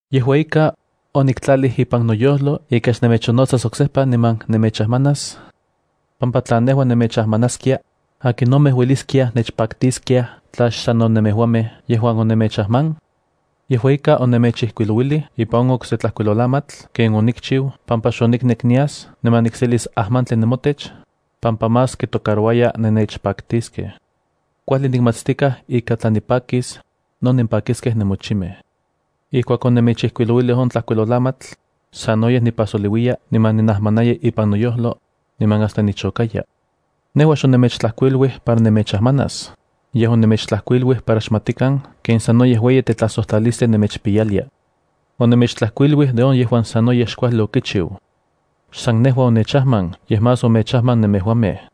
Yejua ika, oniktlalij ipan noyojlo ika xnemechonnotsas oksejpa niman nemechajmanas, pampa tla nejua nemechajmanaskia, ¿akinomej ueliskiaj nechpaktiskiaj tla xsanno nemejuamej yejuan onemechajman? Yejua ika, onemechijkuilouilij ipan on okse tlajkuilolamatl ken onikchiu pampa xoniknek nias niman nikselis ajmantli nemotech, pampa más kitocarouaya nennechpaktiskej. Kuajli nikmatstikaj ika tla nipakis, no nenpakiskej nemochimej. Ijkuak onemechijkuilouilij on tlajkuilolamatl, sanoyej nipajsoliuiya niman ninajmanaya ipan noyojlo, niman hasta nichokaya. Nejua xonemechtlajkuiluij para nemechajmanas, yej onemechtlajkuiluij para xmatikan ken sanoyej ueyi tetlajsojtlalistli nemechpiyalia. Onemechtlajkuiluij de on yejuan sanoyej xkuajli okichiu. Xsan nejua onechajman yej más omechajman nemejuamej.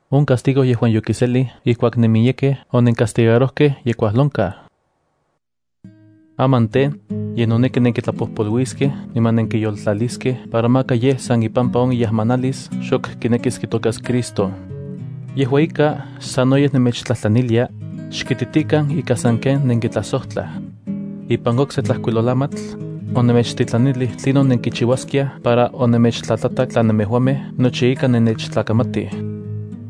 On castigo yejuan yokiselij ijkuak nenmiyekej onencastigarojkej ye kuajlonkaj. Aman tej, ye noneki nenkitlapojpoluiskej niman nenkiyoltlaliskej para maka yej san ipampa on iajmanalis xok kinekis kitokas Cristo. Yejua ika, sanoyej nemechtlajtlanilia, xkititikan ika sanken nenkitlajsojtlaj. Ipan okse tlajkuilolamatl, onemechtitlanilij tlinon nenkichiuaskia para onemechtlatlatak tla nemejuamej nochi ika nennechtlakamatij.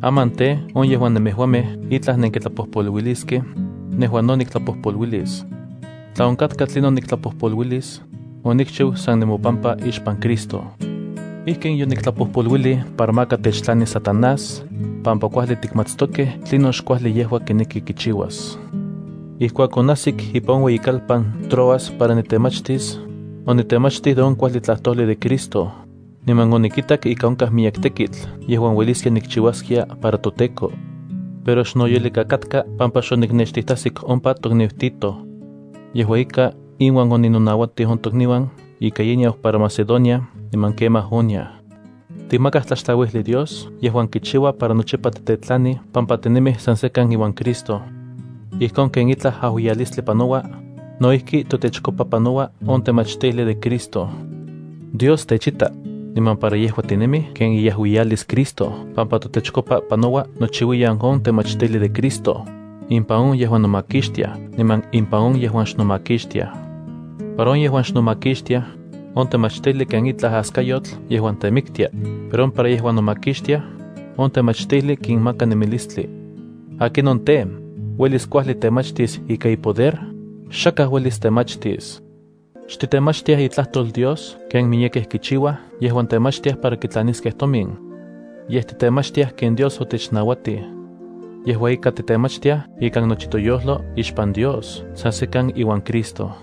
Aman tej, on yejuan nemejuamej itlaj nenkitlapojpoluiliskej, nejua no niktlapojpoluilis. Tla onkatka tlinon niktlapojpoluilis, onikchiu san nemopampa ixpan Cristo. Ijkin yoniktlapojpoluilij para maka techtlanis Satanás, pampa kuajli tikixmatstokej tlinon xkuajli yejua kineki kichiuas. Ijkuak onajsik ipan on ueyikalpan Troas para nitemachtis, onitemachtij de on kuajli tlajtojli de Cristo, niman onikitak ika onkaj miyek tekitl yejuan ueliskia nikchiuaskia para toTEKO. Pero xnoyolika katka pampa xoniknextijtajsik ompa tokniu Tito. Yejua ika, inuan oninouatij on tokniuan ika ye niau para Macedonia niman kemaj oniaj. Tikmakaj tlaxtlauijli Dios yejuan kichiua para nochipa titetlanij pampa tinemij san sekan iuan Cristo. Ijkon ken itlaj ajuiyalistli panoua, no ijki totechkopa panoua on temachtijli de Cristo. Dios techita, niman para yejua tinemij ken iajuiyalis Cristo pampa totechkopa panoua nochiuiyan on temachtijli de Cristo, impan on yejuan nomakixtiaj niman impan on yejuan xnomakixtiaj. Para on yejuan xnomakixtiaj, on temachtijli ken itlaj askayotl yejuan temiktia, pero para on yejuan nomakixtiaj, on temachtijli kinmaka nemilistli. ¿Akinon tej, uelis kuajli temachtis ika ipoder? ¡Xakaj uelis temachtis! Xtitemachtiaj itlajtol Dios ken miyekej kichiuaj yejuan temachtiaj para kitlaniskej tomin. Yej titemachtiaj ken Dios otechnauatij. Yejua ika, titemachtiaj ikan nochi toyojlo ixpan Dios san sekan iuan Cristo.